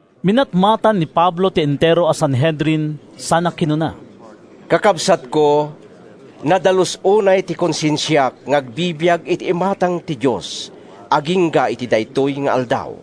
Minatmatan ni Pablo ti entero a Sanhedrin sana kinuna: “Kakabsatko, nadalus unay ti konsensiak nga agbibiag iti imatang ti Dios agingga iti daytoy nga aldaw.”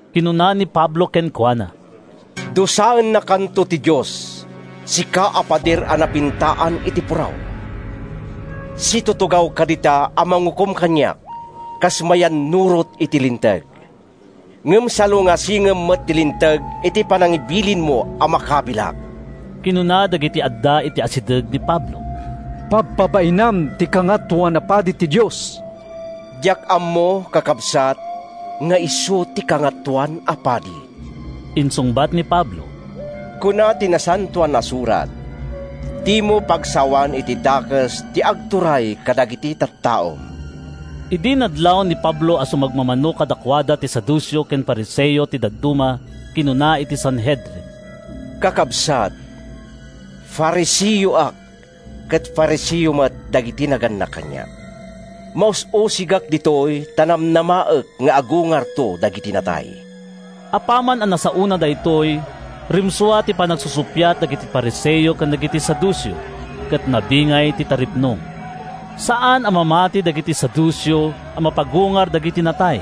Kinuna ni Pablo kenkuana, “Dusaennakanto ti Dios, sika a pader a napintaan iti puraw. Situtugawka dita a mangukom kaniak kas mayannurot iti Linteg, ngem salungasingem met ti Linteg iti panangibilinmo a makabilak!” Kinuna dagiti adda iti asideg ni Pablo, “Pabpabainam ti Kangatoan a Padi ti Dios!” “Diak ammo, kakabsat, nga isu ti Kangatoan a Padi,” insungbat ni Pablo. “Kuna ti Nasantoan a Surat, ‘Dimo pagsawan iti dakes ti agturay kadagiti tattaom.’” Idi nadlaw ni Pablo a sumagmamano kadakuada ti Saduceo ket Fariseo ti dadduma, kinunana iti Sanhedrin, “Kakabsat, Fariseoak ket Fariseo met dagiti nagannak kaniak. Maus-usigak ditoy ta namnamaek nga agungarto dagiti natay!” Apaman a nasaona daytoy, rimsua ti panagsusuppiat dagiti Fariseo ken dagiti Saduceo, ket nabingay ti taripnong. Saan a mamati dagiti Saduceo a mapagungar dagiti natay,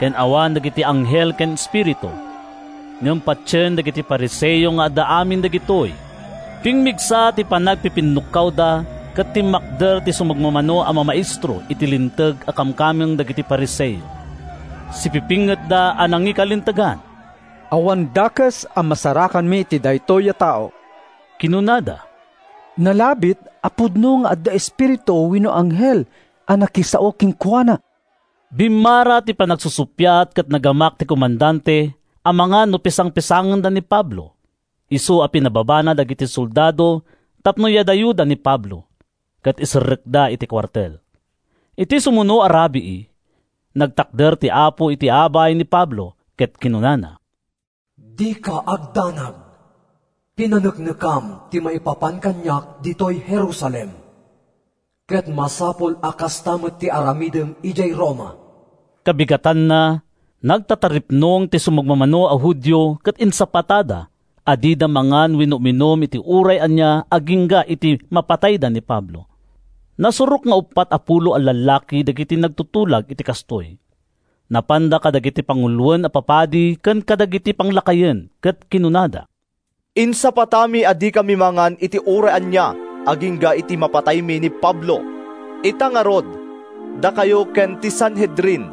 ken awan dagiti anghel ken espiritu. Ngem patien dagiti Fariseo nga adda amin dagitoy. Pimmigsa ti panagpipinnukkawda ket timmakder ti sumagmamano a mamaestro iti Linteg a kamkameng dagiti Fariseo. Sipipingetda a nangikalintegan. “Awan dakes a masarakanmi iti daytoy a tao,” kinunada. “Nalabit a pudno nga adda espiritu wenno anghel a nakisao kenkuana!” Bimmara ti panagsusuppiat ket nagamak ti komandante amangan no pisangpisangenda ni Pablo, isu a pinababana dagiti soldado tapno yadayoda ni Pablo, ket iserrekda iti kuartel. Iti sumuno a rabii, nagtakder ti Apo iti abay ni Pablo ket kinunana, “Dika agdanag! Pinaneknekam ti maipapan kaniak ditoy Jerusalem, ket masapul a kasta met ti aramidem idiay Roma.” Kabigatanna, nagtataripnong ti sumagmamano a Judio ket insapatada a dida mangan wenno uminum iti uray ania agingga iti mapatayda ni Pablo. Nasurok nga uppat a pulo a lallaki dagiti nagtutulag iti kastoy. Napanda kadagiti panguloen a papadi ken kadagiti panglakayen ket kinunada, “Insapatami a dikami mangan iti uray ania agingga iti mapataymi ni Pablo. Ita ngarud, dakayo ken ti Sanhedrin,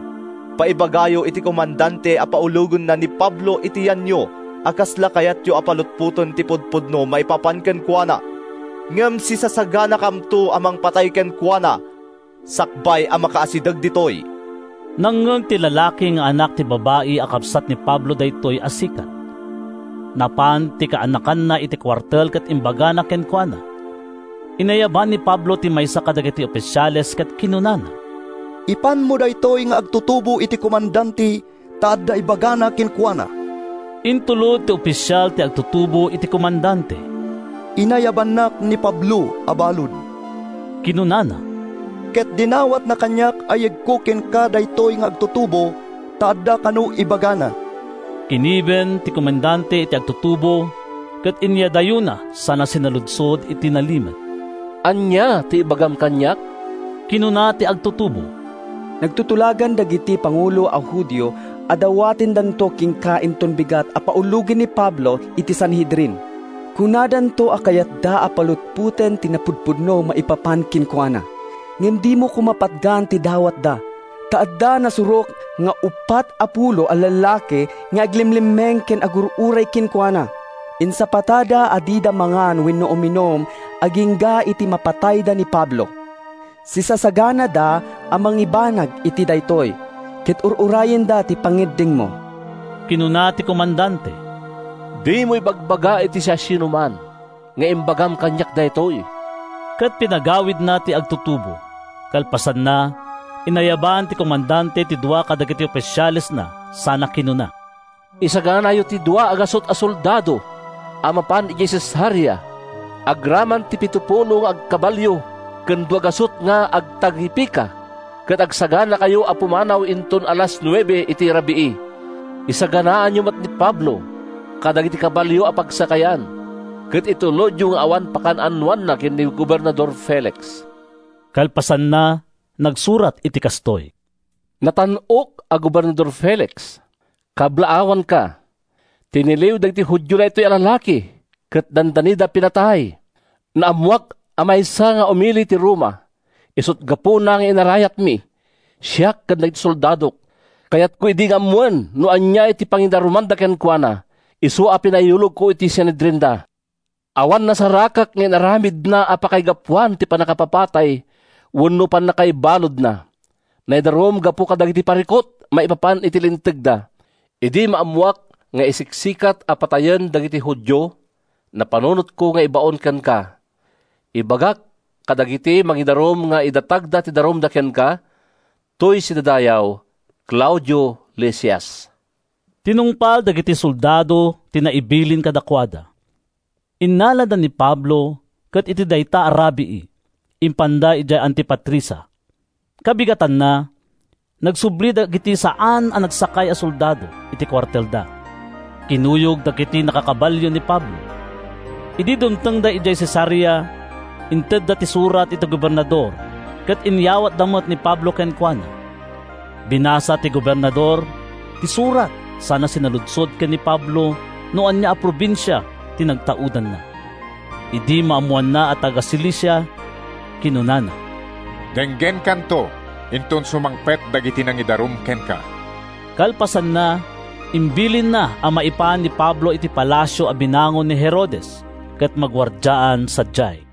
paibagayo iti komandante a paulogenna ni Pablo iti yanyo a kasla kayatyo a palutpoten ti pudpudno maipapan kenkuana. Ngem sisasaganakamto a mangpatay kenkuana sakbay a makaasideg ditoy.” Nangngeg ti lalaki nga anak ti babai a kabsat ni Pablo daytoy a sikat. Napan ti kaanakanna iti kuartel ket imbagana kenkuana. Inayaban ni Pablo ti maysa kadagiti ofisiales ket kinunana, “Ipanmo daytoy nga agtutubo iti komandante ta adda ibagana kenkuana.” Intulod ti ofisial ti agtutubo iti komandante. “Inayabannak ni Pablo a balud,” kinunana, “ket dinawatna kaniak a yegko kenka daytoy nga agtutubo, ta adda kano ibagana.” Kinibin ti komandante ti agtutubo ket inyadayona sana sinaludsod iti nalimed, “Ania ti ibagam kaniak?” Kinuna ti agtutubo, “Nagtutulagan dagiti pangulo a Judio a dawatendanto kenka inton bigat a paulogem ni Pablo iti Sanhedrin. Kunadanto a kayatda a palutpoten ti napudpudno maipapan kenkuana. Ngem dimo koma patgan ti dawatda, ta adda nasurok nga uppat a pulo a lallaki nga aglemlemmeng ken agur-uray kenkuana. Insapatada a dida mangan wenno uminum agingga iti mapatayda ni Pablo. Sisasaganada a mangibanag iti daytoy, ket ur-urayenda ti pangngeddengmo.” Kinuna ti komandante, “Dimo ibagbaga iti siasinoman nga imbagam kaniak daytoy.” Ket pinagawidna ti agtutubo. Kalpasanna, inayaban ti komandante ti dua kadagiti ofisialesna sana kinuna, “Isaganayo ti dua gasut a soldado a mapan idiay Cesarea, agraman ti pitopulo nga agkabalio ken dua gasut nga agtagipika, ket agsaganakayo a pumanaw inton alas nuebe ita a rabii. Isaganaanyo met ni Pablo kadagiti kabalio a pagsakayan, ket itulodyo nga awan pakaan-anoanna ken ni Gobernador Felix.” Kalpasanna, nagsurat iti kastoy: “Natan-ok a Gobernador Felix: “Kablaawanka. Tiniliw dagiti Judio daytoy a lalaki ket dandanida pinatay. Naammoak a maysa nga umili ti Roma, isut’ gapuna nga inarayatmi, siak ken dagiti soldadok. Kayatko idi nga ammoen no ania ti pangidarumanda kenkuana, isu a pinayulogko iti Sanhedrinda. Awan nasarakak nga inaramidna a pakaigapuan ti pannakapapatay wenno pannakaibaludna. Naidarum gapu kadagiti parikut maipapan iti lintegda. Idi maammoak nga isiksikat a papatayen dagiti Judio, napanunotko nga ibaon kenka. Imbagak kadagiti mangidarum nga idatagda ti darumda kenka. Toy sidadayaw, Claudio Lisias.” Tinungpal dagiti soldado ti naibilin kadakuada. Innalada ni Pablo ket iti dayta a rabii, impanda idiay Antipatrisa. Kabigatanna, nagsubli dagiti saan a nagsakay a soldado iti kuartelda. Kinuyog dagiti nakakabalio ni Pablo. Idi dumtengda idiay Cesarea, intedda ti surat iti gobernador ket inyawatda met ni Pablo kenkuana. Binasa ti gobernador ti surat sana sinaludsod ken ni Pablo no ania a probinsia ti nagtaudanna. Idi maammoanna a taga-Cilicia, kinunana, “Denggenkanto inton sumangpet dagiti nangidarum kenka.” Kalpasanna, imbilinna a maipan ni Pablo iti palasio a binangon ni Herodes ket maguardiaan sadiay.